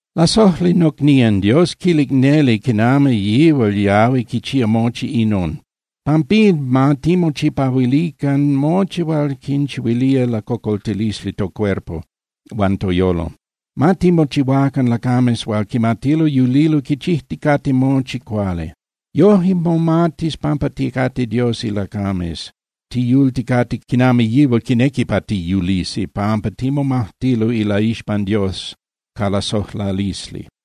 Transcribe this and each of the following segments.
Lasojli nocnían, Dios quilic neli quinami yihual yahui quichía mochi inon. Pampín, ma timochipahuilican mochi hual quinchihuilía lacocoltilisli tocuerpo huan toyolo. Ma timochihuacan lacames hual quimatilo yulilo quichijticate mochi cuali. Yoje momatis pampa ticate Dios ilacames, tiyulticate quinami yihual quinequi pa tiyulisi, pampa timomajtilo ilaixpan Dios ca lasojlalisli.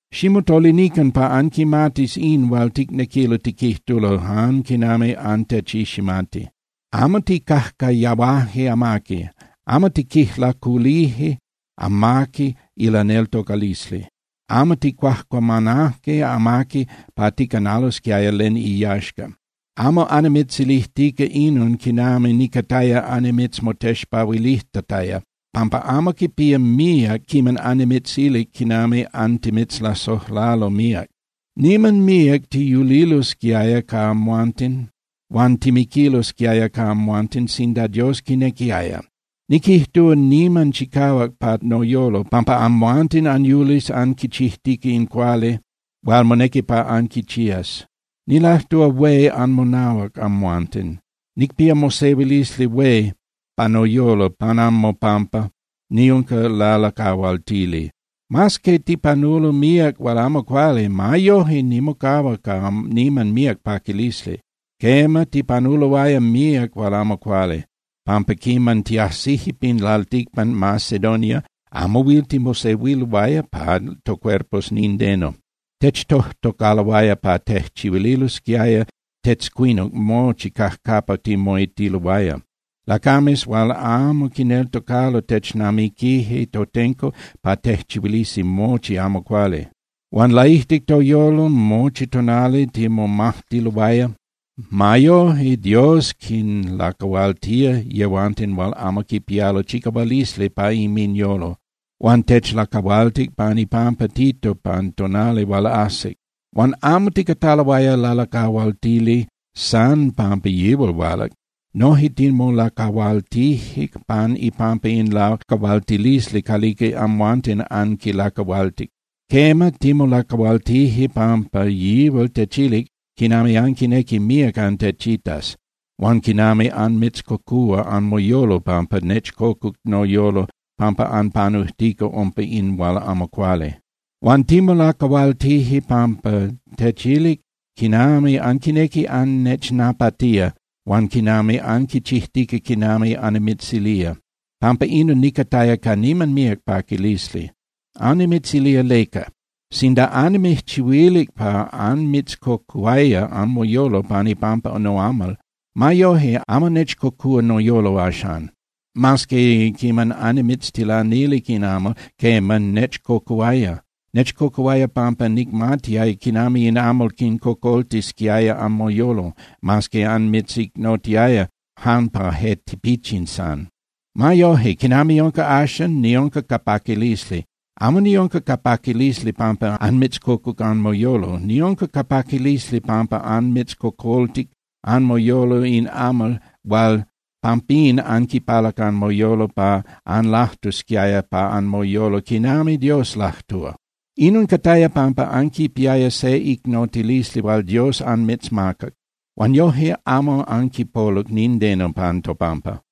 ¡Ximotolinican pa anquimatis in hual ticnequilo tiquijtulo jan quinami antechiximati! Amo tijcajcayahuaje amaqui, amo tiquijlaculije amaqui ilaneltocalisli, amo tijcuajcuamanaje amaqui pa ticanalosquiaya len iyaxca. Amo annimitzilijtica inon quinami nicataya annimitzmotexpahuilijtataya, pampa amo quipía míac quiman annimitzilic quinami antimitzlasojlalo míac. Niman míac tiyulilosquiaya ca amhuanten huan timiquilosquiaya ca amhuanten sinda Dios quinequiaya. Niquijtúa niman chicahuac pa noyolo pampa amhuanten anyulis anquichijtica in cuali hual monequi pa anquichías. Nilajtúa hué anmonahuac amhuanten. Nicpía mosehuilisli hué pa noyolo pan anmopampa, niunca lalacahualtili. Mas que tipanulo míac hual amo cuali, ma yoje nimocahua ca niman míac paquilisli. Quema, tipanuloaya míac hual amo cuali, pampa quiman tiajsije pin lalticpan Macedonia, amo huil timosehuiloaya pa tocuerpos nindeno. Techtojtocaloaya pa tejchihuililosquiaya tetzcuinuc mochi cajcapa timoitililoaya. Lacames hual amo quineltocalo technamiquije totenco pa tejchihuilisi mochi amo cuali. Huan laijtic toyolo mochi tonali timomajtiloaya. Ma yoje, Dios quinlacahualtía yehuanten hual amo quipialo chicahualisli pa inminyolo, huan techlacahualtic pan ipampa Tito pan tonali hual ajsic. Huan amo ticataloaya lalacahualtili san pampa yihual hualac. Noje timolacahualtije pan ipampa in lacahualtilisli calica amhuanten anquilacahualtic. Quema, timolacahualtije pampa yihual techilic quinami anquinequi míac antechitas, huan quinami anmitzcocúa anmoyolo pampa nechcocuc noyolo pampa anpanujtica umpa in hual amo cuali. Huan timolacahualtije pampa techilic quinami anquinequi annechnapatía huan quinami anquichijtica quinami annimitzilía. Pampa inon nicataya ca niman míac paquilisli. Annimitzilía leca. Sinda annimijchihuilic pa anmitzcocuhuaya anmoyolo pan ipampa noamal, ma yoje amo nechcocúa noyolo axan, mas que quiman annimitztilanilic in amal, quema, nechcocuhuaya. Nechcocuhuaya pampa nicmatiaya quinami in amal quicocoltisquiaya anmoyolo, mas qee anmitzicnotiaya jan pa je tipichin san. Ma yoje, quinami unca axan, niunca ca paquilisli. Amo niunca ca paquilisli pampa anmitzcocuc anmoyolo. Niunca ca paquilisli pampa anmitzcocoltic anmoyolo in amal huan pampín anquipalac anmoyolo pa anlajtusquiaya pa anmoyolo quinami Dios lajtúa. Inon cataya pampa anquipiaya se icnotilisli hual Dios anmitzmacac, huan yoje amo anquipoluc nindeno pan topampa.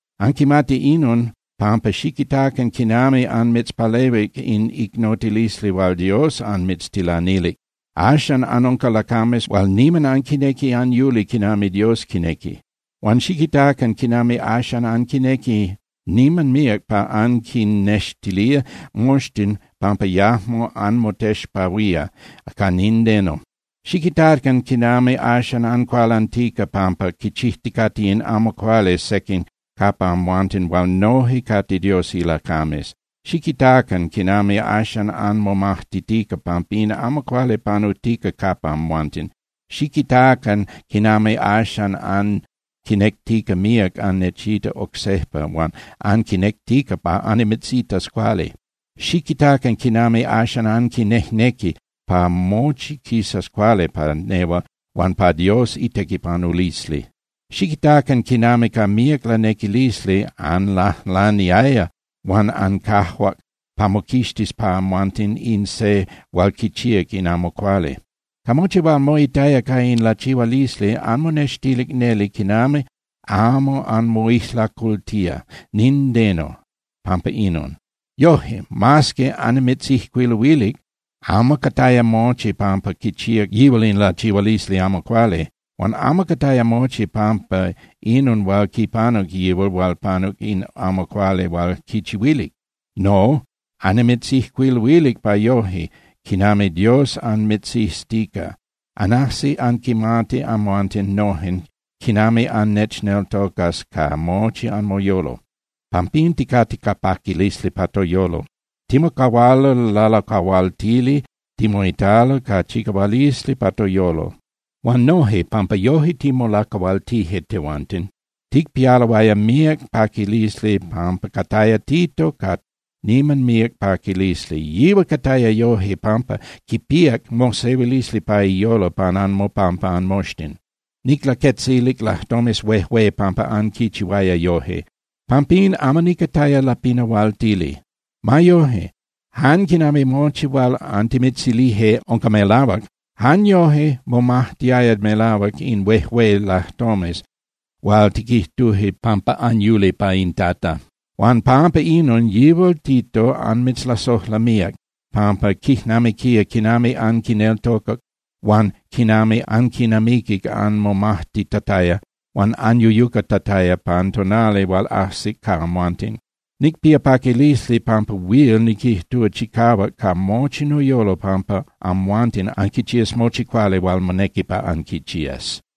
Anquimati inon, pampa xiquitacan quinami anmitzpalehuic in icnotilisli hual Dios anmitztilanilic. Axan anunca lacames hual niman anquinequi anyuli quinami Dios quinequi. Huan xiquitacan quinami axan anquinequi niman míac pa anquinnextilía moxtin pampa yajmo anmotexpahuía ca nindeno. Xiquitacan quinami axan ancualantica pampa quichijticate in amo cuali sequin capa amhuanten hual noje cate Dios ilacames. Xiquitacan quinami axan anmomajtitica pampa in amo cuali panujtica capa amhuanten. Xiquitacan quinami axan anquinectica míac annechita oc sejpa huan anquinectica pa annimitzitas cuali. Xiquitacan quinami axan anquinejnequi pa mochi quisas cuali pa nehual huan pa Dios itequipanulisli. Xiquitacan quinami ca míac lanequilisli anlajlaniaya huan ancajuac pa moquixtis pa amhuanten in se hual quichíac in amo cuali. Ca mochi hual moitaya ca in lachihualisli, anmonextilic neli quinami amo anmoijlacultía nindeno pampa inon. Yoje, mas que annimitzijcuiluilic, amo cataya mochi pampa quichíac yihual in lachihualisli amo cuali. Huan amo cataya mochi pampa inon hual quipanuc yihual hual panuc in amo cuali hual quichihuilic. No, annimitzijcuiluilic pa yoje, quinami Dios anmitziztica, anajsis anquimatis amhuanten nojen quinami annechneltocas ca mochi anmoyolo. Pampín ticate ca paquilisli pa toyolo. Timocahualo lalacahualtili, timoitalo ca chicahualisli pa toyolo. Huan noje, pampa yoje timolacahualtije tehuanten, ticpialoaya míac paquilisli pampa cataya Tito ca niman míac paquilisli. Yihual cataya yoje, pampa quipíac mosehuilisli pa iyolo pan anmopampa anmoxtin. Niclaquetzilic lajtomes huejué pampa anquichihuaya yoje. Pampín, amo nicataya lapinahualtili. Ma yoje, jan quinami mochi hual antimitzilije unca melahuac, jan yojque momatiaya melahuac in huejué lajtomes hual tiquijtuje pampa anyuli pa in Tata. Huan pampa inon, yihual Tito anmitzlasojla míac, pampa quijnamiquía quinami anquineltocac huan quinami anquinamiquic anmomajtitataya huan anyuyucatataya pan tonali hual ajsic ca amhuanten. Nicpía paquilisli, pampa huil niquijtúa chicahuac ca mochi noyolo pampa amhuanten anquichías mochi cuali hual monequi pa anquichías.